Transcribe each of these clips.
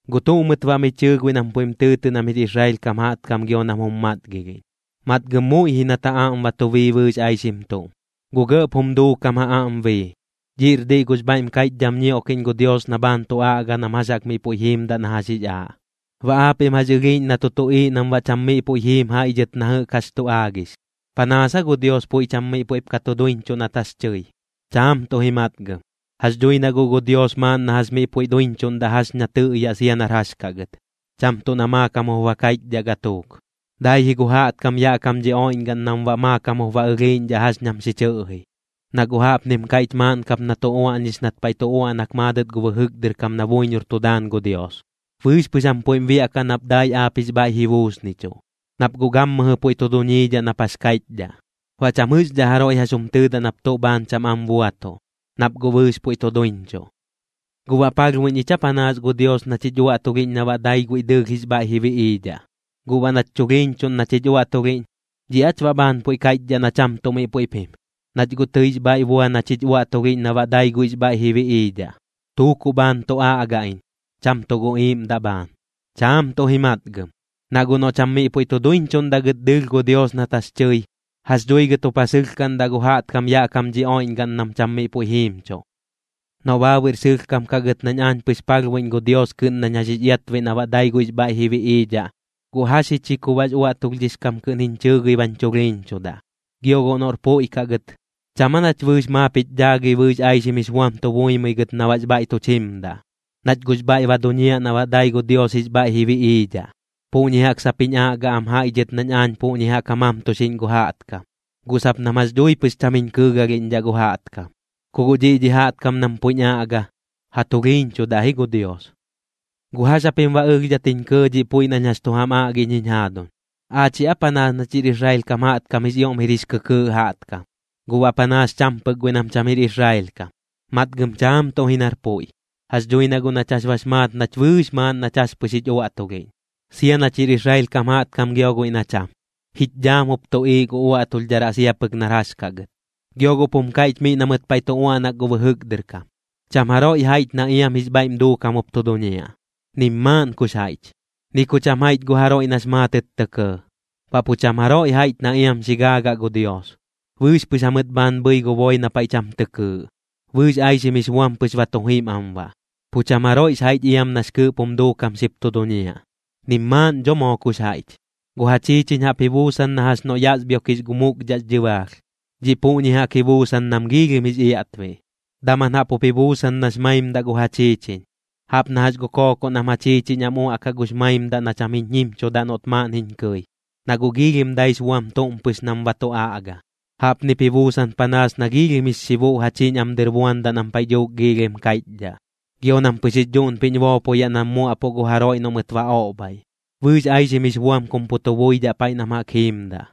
¿Guꞌ tuꞌ mɨt baꞌ mi chɨɨ guiꞌ nam puiꞌm tɨɨtɨꞌ nam jir Israel kam jaꞌtkam gio nam jum matgilhiꞌñ? Matgɨm muiꞌ ji nat ja aꞌm ba tu bii bɨɨx aixim tuꞌm. Gu gɇꞌp jum duukam ja aꞌm bii, dhiꞌr diꞌ gux bhaiꞌm kaiꞌchdham ñioꞌkiꞌñ gu Dios na bhaan tu aꞌga nam jax jaꞌk miꞌ puiꞌ jiimdaꞌ na jax jix aaꞌ. ¿Baꞌ aapiꞌm jax ɨlhiiꞌñ na tu tuꞌiiꞌ nam baꞌ cham miꞌ puiꞌ jiim jaiꞌ dhɨt na jɨꞌk jax tu aagix? ¿Panaas aa gu Dios puiꞌ cham miꞌ puiꞌp ka tu duiñchuꞌ nat jax tɨi? Chaam tuꞌ ji matgɨm. Jax dhui na guꞌ gu Dios maaꞌn na jax miꞌ puiꞌ duiñchuꞌndaꞌ jax na tɨꞌyaꞌ sia nar jax kaꞌ gɨt, cham tuꞌ na maakam jup ba kaiꞌchdhaꞌ gatuuk. Dai ji gu jaꞌtkam yaꞌ kam dhi oiꞌñgaꞌn nam baꞌ maakam jup ba ɨlhiiꞌñdhaꞌ jax nam xi chɨꞌji. Na guꞌ jaꞌpnim kaiꞌch maaꞌn kap na tu uaꞌñix nat paiꞌ tu uaꞌnak maadɨt gu bɨjɨk dɨr kam na buiñor tu daan gu Dios: Bɨɨx pɨx jam puiꞌm biaꞌkaꞌ nap dai aap jix bhaiꞌ ji buusnichuꞌ, nap guꞌ gammɨjɨ puiꞌ tu duñiidhaꞌ nap jax kaiꞌchdhaꞌ. Baꞌ cham jɨꞌxdhaꞌ jaroiꞌ jax jum tɨɨdaꞌ nap tuꞌ bhaan cham am buatuꞌ, nap guꞌ bɨɨx puiꞌ tu duiñchuꞌ. ¿Guꞌ baꞌ palhbuiꞌñ ich aa panaas gu Dios nach jich uaꞌtulhiꞌñ na baꞌ dai guiꞌ dɨɨlh jix bhaiꞌ ji biꞌiidhaꞌ? Guꞌ baꞌ nach chulhiiñchuꞌn nach jich uaꞌtulhiꞌñ, ¿dhiꞌ aach baꞌ bhaan puiꞌ kaiꞌchdhaꞌ na cham tuꞌ miꞌ puiꞌp jim, nach guꞌ tɨix bhaiꞌ bua nach jich uaꞌtulhiꞌñ na baꞌ dai guiꞌx bhaiꞌ ji biꞌiidhaꞌ? Tuukuꞌ bhaan tu aꞌga iñ, cham tuꞌ gu iiꞌmdaꞌ bhaan. Chaam tuꞌ ji matgɨm. Na guꞌ noꞌ cham miꞌ puiꞌ tu duiñchuꞌndaꞌ gɨt dɨɨlh gu Dios nat jax tɨi, ¿jax dhui gɨt jup ja sɨlhkaꞌndaꞌ gu jaꞌtkam yaꞌ kam dhi oiꞌñgaꞌn nam cham miꞌ puiꞌ jiimchuꞌ? Noꞌ baabuiꞌr sɨlhkam kaꞌ gɨt nañ aañ pɨx palhbuiꞌñ gu Dios kɨꞌn nañ jax jix iatbiꞌ na baꞌ dai guiꞌx bhaiꞌ ji biꞌiidhaꞌ, ¿guꞌ jax ji chi ku baꞌx uaꞌtulhdhix kam kɨꞌn jiñ chɨɨgɨi bañ chulhiiñchudaꞌ? Gio guꞌ noꞌr puiꞌ kaꞌ gɨt, ¿cham aa nach bɨɨx maap jich dhaagɨi bɨɨx aixim jix buam tu buimɨi gɨt na baꞌx bhaiꞌ tuch jimdaꞌ, nach guꞌx bhaiꞌ ba duñiaꞌ na baꞌ dai gu Dios jix bhaiꞌ ji biꞌiidhaꞌ? Puꞌñi jaꞌk sap jiñ aꞌga am jaiꞌ dhɨt nañ aañ puꞌñi jaꞌk ja mamtuxiꞌñ gu jaꞌtkam, guꞌ sap nam jax dhui pɨx cham jiñ kɨɨgalhiꞌñdhaꞌ gu jaꞌtkam. Ku guꞌ dhiꞌ dhi jaꞌtkam nam puiꞌñ aꞌga, ja tulhiiñchudaꞌ ji gu Dios. ¿Guꞌ jax japim baꞌ ɨlhdhat jiñ kɇɇ dhiꞌ puiꞌ nañ jax chu jam aꞌgiꞌñ jiñ jaaduñ? ¿Aachiꞌ aa panaas nach jir Israel kam jaꞌtkam jix ioꞌm jir jix kɨkɨɨꞌ jaꞌtkam, guꞌ baꞌ panaas cham pɨk guiꞌ nam cham jir Israel kam? Matgɨm chaam tuꞌ ji nar puiꞌ. Jax dhui na guꞌ nach jax bax maat nach bɨɨx maaꞌn nach jax pɨx jich uaꞌtulhiꞌñ, sia nach jir Israel kam jaꞌtkam gio guiꞌ na cham, jich dhaam jup tuꞌiiꞌ gu uaꞌtulhdharaꞌ sia pɨk nar jax kaꞌ gɨt. Gio guꞌp jum kaiꞌch miꞌ na mɨt paiꞌ tu uaꞌnak gu bɨjɨk dɨr kam: Cham jaroiꞌ jaiꞌch na iam jix bhaiꞌm duukam jup tu duñiaꞌ, nim maaꞌn kux jaiꞌch. Ni ku cham jaiꞌch gu jaroiꞌ nax maatɨt tɇ kɇɇ, baꞌ pu cham jaroiꞌ jaiꞌch na iam xi gaagaꞌ gu Dios. Bɨɨx pɨx jamɨt bhaan bhɨi gu boi na paiꞌ cham tɨ kɨɨꞌ, bɨɨx aixim jix buam pɨx ba tu jim am baꞌ. Pu cham jaroiꞌx jaiꞌch iam nax kɨɨꞌp jum duukam xip tu duñiaꞌ, nim maaꞌn dho moo kux jaiꞌch. Gu ja chiichiñ jaꞌp ji buusan na jax noꞌ yasbhioꞌkix gu mukdhaꞌx dhɨbaalh, dhiꞌ puꞌñi jaꞌk ji buusan nam giilhim jix iaꞌtbiꞌ. Daman jaꞌp jup ji buusan nax maimdaꞌ gu ja chiichiñ, jaꞌp na jax gu kookoꞌ nam ja chiichiñ am uaꞌkaꞌ gux maimdaꞌ na cham jiñ jimchudaꞌ noꞌt maaꞌn jiñ kɨi, na guꞌ giilhim daix buam tuꞌm pɨx nam ba tu aꞌga. Jaꞌpnip ji buusan panaas na giilhim jix xibuꞌ ja chiñ am dɨr buandaꞌ nam paiꞌ dhuuk giilhim kaiꞌchdhaꞌ. Gio nam pɨx jix dhuꞌnpiꞌñ boopoyaꞌ nam muaꞌpuꞌ gu jaroiꞌ noꞌ mɨt ba oꞌbhaiꞌ. Bɨɨx aixim jix buam kum pu tu buidhaꞌ paiꞌ nam jaꞌk jiimdaꞌ,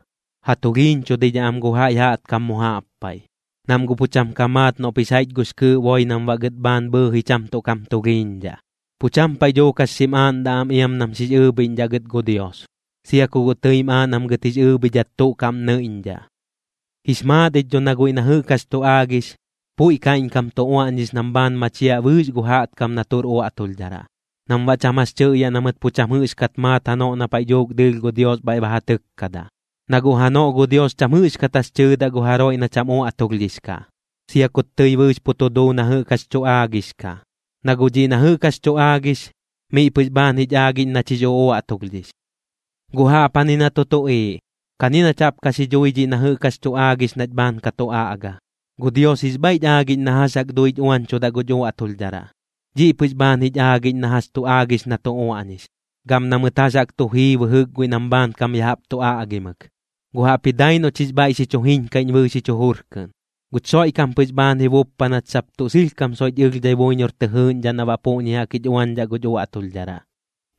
ja tulhiiñchudidhaꞌ am gu jaiꞌ jaꞌtkam mu jaꞌp paiꞌ. Nam guꞌ pu cham ka maat noꞌp jix jaiꞌch gux kɨɨꞌ boi nam baꞌ gɨt bhaan bhɨɨji cham tuꞌ kam tulhiiñdhaꞌ, pu cham paiꞌ dhuuk jax xim aaꞌndaꞌ am iam nam xix ɨɨbhiꞌñdhaꞌ gɨt gu Dios, sia ku guꞌ tɨim aaꞌ nam gɨt jix ɨɨbhidhat tuꞌ kaꞌm nɨiꞌñdhaꞌ. Jix maat ich dho na guiꞌ na jɨꞌk jax tu aagix, puiꞌ kaiꞌñkam tu uaꞌñix nam bhaan machiaꞌ bɨɨx gu jaꞌtkam na tuꞌr uaꞌtulhdharaꞌ, nam baꞌ cham jax tɨꞌyaꞌ na mɨt pu cham jɨꞌxkat maat janoꞌ na paiꞌ dhuuk dɨɨlh gu Dios bhaiꞌ ba ja tɨkkadaꞌ. Na guꞌ janoꞌ gu Dios cham jɨꞌxkat jax tɨɨdaꞌ gu jaroiꞌ na cham uaꞌtulhdhix kaꞌ, sia kut tɨi bɨɨx pu tu duu na jɨꞌk jax tu aagix kaꞌ. Na guꞌ dhiꞌ na jɨꞌk jax tu aagix, miꞌ pɨx bhaan jich aagiꞌñ nach jix uꞌuaꞌtulhdhix. Guꞌ jaꞌpjani na tu tuꞌiiꞌ, kani nach jaꞌp ka xi dhui dhiꞌ na jɨꞌk jax tu aagix nach bhaan ka tu aꞌga. Guꞌ Dios jix bhaiꞌch aagiꞌñ na jax jaꞌk duich uañchudaꞌ guch uaꞌtulhdharaꞌ, dhiꞌ pɨx bhaan jich aagiꞌñ na jax tu aagix na tu uaꞌñix, gam na mɨt jax jaꞌk tu jii bɨjɨk guiꞌ nam bhaankam ya jaꞌp tu aꞌgimɨk, guꞌ jaꞌpji dai noꞌch jix bhaiꞌ xi chu jiñkaiꞌñ bɨɨx jich jujur kɨꞌn. Guch Xoiꞌkam pɨx bhaan ji buppa nach sap tuꞌ sɨlhkam soiꞌch ɨlhdhai buiñor tɨ jɨɨꞌñdhaꞌ na baꞌ puꞌñi jaꞌk jich uañdhaꞌ guch uaꞌtulhdharaꞌ.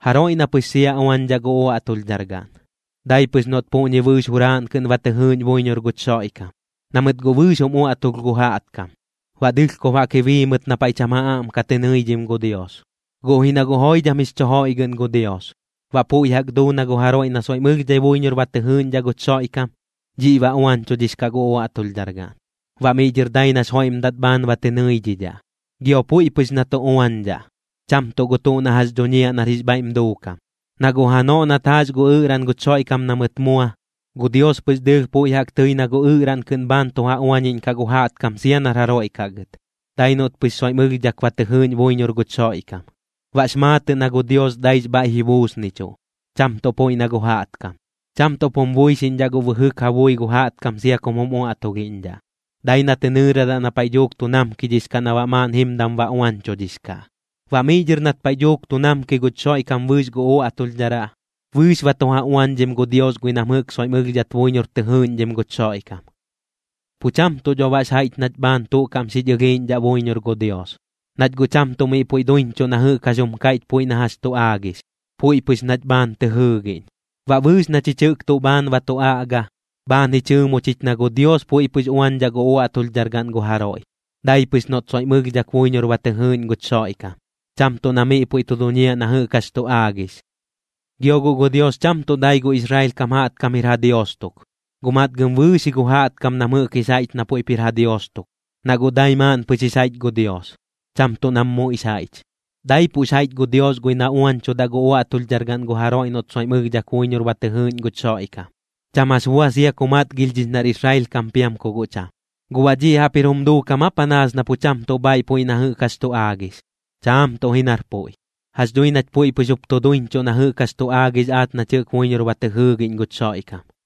Jaroiꞌ na pɨx sia uañdhaꞌ gu uaꞌtulhdhargaꞌn, dai pɨx noꞌt puꞌñi bɨɨx juraaꞌn kɨꞌn ba tɨ jɨɨꞌñ buiñor guch Xoiꞌkam. Na mɨt guꞌ bɨɨx jum uaꞌtulh gu jaꞌtkam, baꞌ dɨlhkob jaꞌk ji bii mɨt na paiꞌ cham ja aꞌm ka tɨ nɨidhim gu Dios. Guꞌ ji na guꞌ joidham jix chu joiꞌgɨꞌn gu Dios, baꞌ puiꞌ jaꞌk duu na gu jaroiꞌ na soiꞌm ɨlhdhai buiñor ba tɨ jɨɨꞌñdhaꞌ guch Xoiꞌkam, dhiꞌ ba uañchudhix kaꞌ gu uaꞌtulhdhargaꞌn, baꞌ miꞌ dhɨr dai nax joiꞌmdat bhaan ba tɨ nɨidhidhaꞌ. Gio puiꞌ pɨx na tu uañdhaꞌ, cham tuꞌ gu tuꞌ na jax dhuñiaꞌ nar jix bhaiꞌm duukam. Na guꞌ janoꞌ nat jaax gu ɨꞌraꞌn guch Xoiꞌkam na mɨt mua, gu Dios pɨx dɨɨlh puiꞌ jaꞌk tɨi na gu ɨꞌraꞌn kɨꞌn bhaan tu ja uañiꞌñkaꞌ gu jaꞌtkam sia nar jaroiꞌ kaꞌ gɨt, dai noꞌt pɨx soiꞌm ɨlhdhak ba tɨ jɨɨꞌñ buiñor guch Xoiꞌkam. Baꞌx maatɨꞌ na gu Dios daix bhaiꞌ ji buusnichuꞌ, cham tuꞌ puiꞌ na gu jaꞌtkam. Cham tuꞌp jum buixiꞌñdhaꞌ guꞌ bɨjɨk ja bui gu jaꞌtkam sia kum jum uaꞌtulhiꞌñdhaꞌ, dai na tɨ nɨɨradaꞌ na paiꞌ dhuuk tu namkidhix kaꞌ na baꞌ maaꞌn jimdam ba uañchudhix kaꞌ. Baꞌ miꞌ dhɨr nat paiꞌ dhuuk tu namki guch Xoiꞌkam bɨɨx gu uaꞌtulhdharaꞌ, bɨɨx ba tu ja uañdhim gu Dios guiꞌ nam jɨꞌk soiꞌm ɨlhdhat buiñor tɨ jɨɨꞌñdhim guch Xoiꞌkam. Pu cham tuꞌ dho baꞌx jaiꞌch nach bhaan tuꞌ kaꞌm xich ɨlhiiꞌñdhaꞌ buiñor gu Dios, nach guꞌ cham tuꞌ miꞌ puiꞌ duiñchuꞌ na jɨꞌk jax jum kaiꞌch puiꞌ na jax tu aagix, puiꞌ pɨx nach bhaan tɨ jɨɨgiꞌñ. Baꞌ bɨɨx na chich jɨꞌk tuꞌ bhaan ba tu aꞌga, bhaan ji chɨɨmo chich na gu Dios puiꞌ pɨx uañdhaꞌ gu uaꞌtulhdhargaꞌn gu jaroiꞌ, dai pɨx noꞌt soiꞌm ɨlhdhak buiñor ba tɨ jɨɨꞌñ guch Xoiꞌkam, cham tuꞌ na miꞌ puiꞌ tu duñiaꞌ na jɨꞌk jax tu aagix. Gio guꞌ gu Dios cham tuꞌ dai gu Israel kam jaꞌtkam jir ja Dios tuk, guꞌ matgɨm bɨɨx ji gu jaꞌtkam nam jɨꞌk jix jaiꞌch na puiꞌp jir ja Dios tuk. Na guꞌ dai maaꞌn pɨx jix jaiꞌch gu Dios, cham tuꞌ nam muiꞌx jaiꞌch. Daipuꞌx jaiꞌch gu Dios guiꞌ na uañchudaꞌ gu uaꞌtulhdhargaꞌn gu jaroiꞌ noꞌt soiꞌm ɨlhdhak buiñor ba tɨ jɨɨꞌñ guch Xoiꞌkam, cham jax bua sia ku matgilhdhix nar Israel kam piam ku guꞌ cham. ¿Guꞌ baꞌ dhiꞌ jaꞌp jir jum duukam aa panaas na pu cham tuꞌ bhaaiꞌ puiꞌ na jɨꞌk jax tu aagix? Chaam tuꞌ ji nar puiꞌ. Jax dhui nach puiꞌ pɨx jup tu duiñchuꞌ na jɨꞌk jax tu aagix aach nach jɨꞌk buiñor ba tɨ jɨɨgiꞌñ guch Xoiꞌkam.